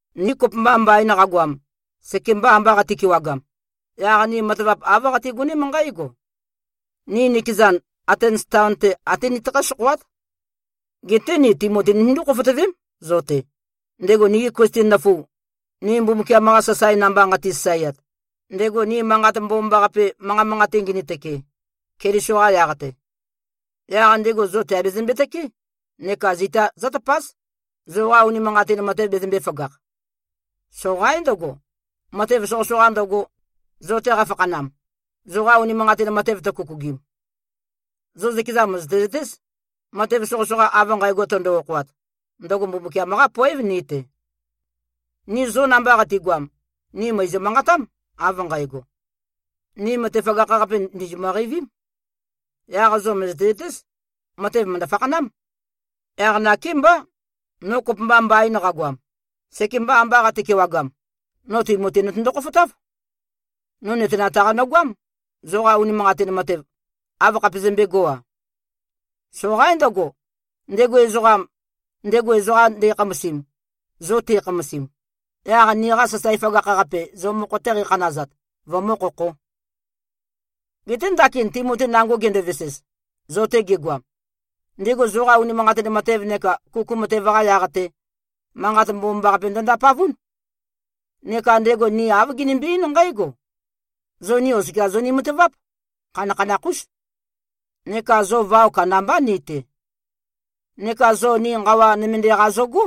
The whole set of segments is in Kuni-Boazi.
Ni kopømba mbain qagoam, sekemba amba qati-kewagam, yaq ni matavap āv qatigoném nqǽgo: Ni nikezan, Atens taon-te até nitøkhǽ-sokhoát. Geté ni Timoti nitøndú-khofotøvém, zo-te, ndego nigi Klisten nøfu, ni Mbumbukiam-qa sasae namba nqati-sasaeat, ndego ni Manqat Mbomambaqape manqa manqate-te ngini-tøke, Keliso-qa yaq-te. Yaq ndego zo tèabezømbe-tøké neka zita zǿtøpáz, zoqa unimanqatin matev bezømbē-føgakh. Soqaín ndøgo, matev soqøsoqa ndøgo, zo-te qafakhanam, zoqa unimanqatin matev tøkukugim. Zo zøkeza mø̀zøte-zøtéz, matev soqøsoqa av nqægo tøndo-okhoat, ndøgo Mbumbukiam-qá poév, ni-te. Ni zo namba qatigoam, ni mø̀izø-manqatám, av nqægo, “Ni matev føgakh-qape, ndìzimø-qeivím.” Yaq zo mø̀zøte-zøtéz, matev mø̀ndø-fakhanám. Yaq nakémbá, no kopømba mbain qagoam, sekemba amba qate-kewagam, no Timoti notøndo-khofotáv. No nøtenat-qa nøgoám, zoqa unimanqatin matev, āv khapezømbēgo-a. Soqaín ndøgo, ndego ezoqam, ndego ezoqa nde꞉khamasim, zo te꞉khamasim, yaq niqa sasae føgakh-qape, zo mokho-te qeikhanazat, vømǿ-khokhō. Geté ndakin Timoti nango gendovesez, zo-te gegoam, ndego zoqa unimanqatin matev neka kuku matev-qa yaq-te, manqat mbomambaqape ndø-ndapavún. Neka ndego ni āv ginimbi-eín nqǽgo: Zo ni oskia zoni-mataváp, khanakhanakh-ús, neka zo vao kandambá ni-te. Neka zo ni nqawa nømende-qa zogó,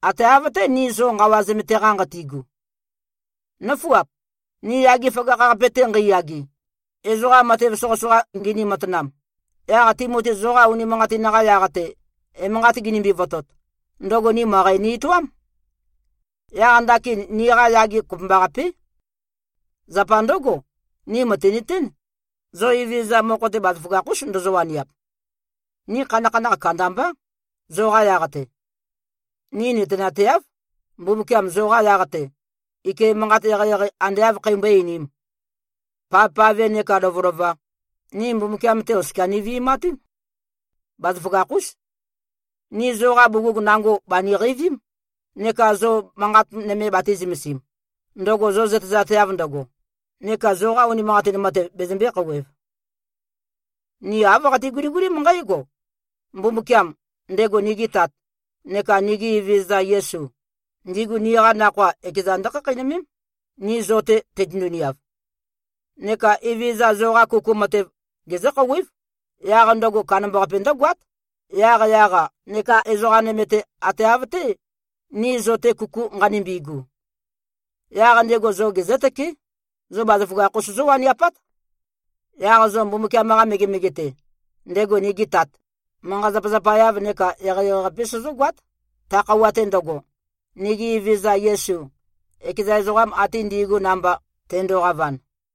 ate av-té, ni zo nqawa zømete-qa nqati꞉gu. Nǿfuap! Ni yage føgakh-qape-te nqeiyage, ezoqa matev soqøsoqa ngini-matanam, yaq Timoti zoqa unimanqatin-qa yaq-te emanqat ginimbi-votot, ndøgo ni møqæ ni-etoám. Yaq ndakin niqa yage kopømbaqapé. Zapa ndǿgo, ni mø̀tinøtén, zo Evezøza mokho-te, bazaføgakh-ús ndozo-waniap. Ni khanakhanakh kandambá, zoqa yaq-te. Ni nøtenateáv, Mbumbukiam zoqa yaq-te, ike manqat eqeieqei ande āv kheimbøé-einīm. Pavpave nekā lovølova, ni Mbumbukiam-te oskia nivi꞉matún. Bazaføgakh-ús. Ni zoqa bugug nango bàniqeivím neka zo manqat nøme batī-zømesim, ndøgo zo zøtezateav ndøgo, neka zoqa unimanqatin matev bezømbē-khouwev. Ni āv qati-guligulím nqǽgo: Mbumbukiam, ndego nigi Tat, neka nigi Evezøza Yesu, ndigu niqa nakhoa ekeza ndǿkhakheinømém, ni zo-te teitøndu-niav. Neka Evezøza, zoqa kuku matev gezǿ-khouwév, yaq ndøgo kandambaqape ndǿgoát, yaqyaq-a nekā ezoqa nøme-te, ate av-té, ni zo-te kuku nqanimbi꞉gu. Yaq ndego zo gezǿtøké, zo bazaføgakh-us zówaniapát. Yaq zo Mbumbukiam-qa megemege-te, ndego nigi Tat, manqa-zapazapa-yav neka eqeieqei-qape sozógoát, ta khøuwa-te ndøgo, nigi Evezøza Yesu, ekeza ezoqam ate ndi꞉gu namba, tendoqavan.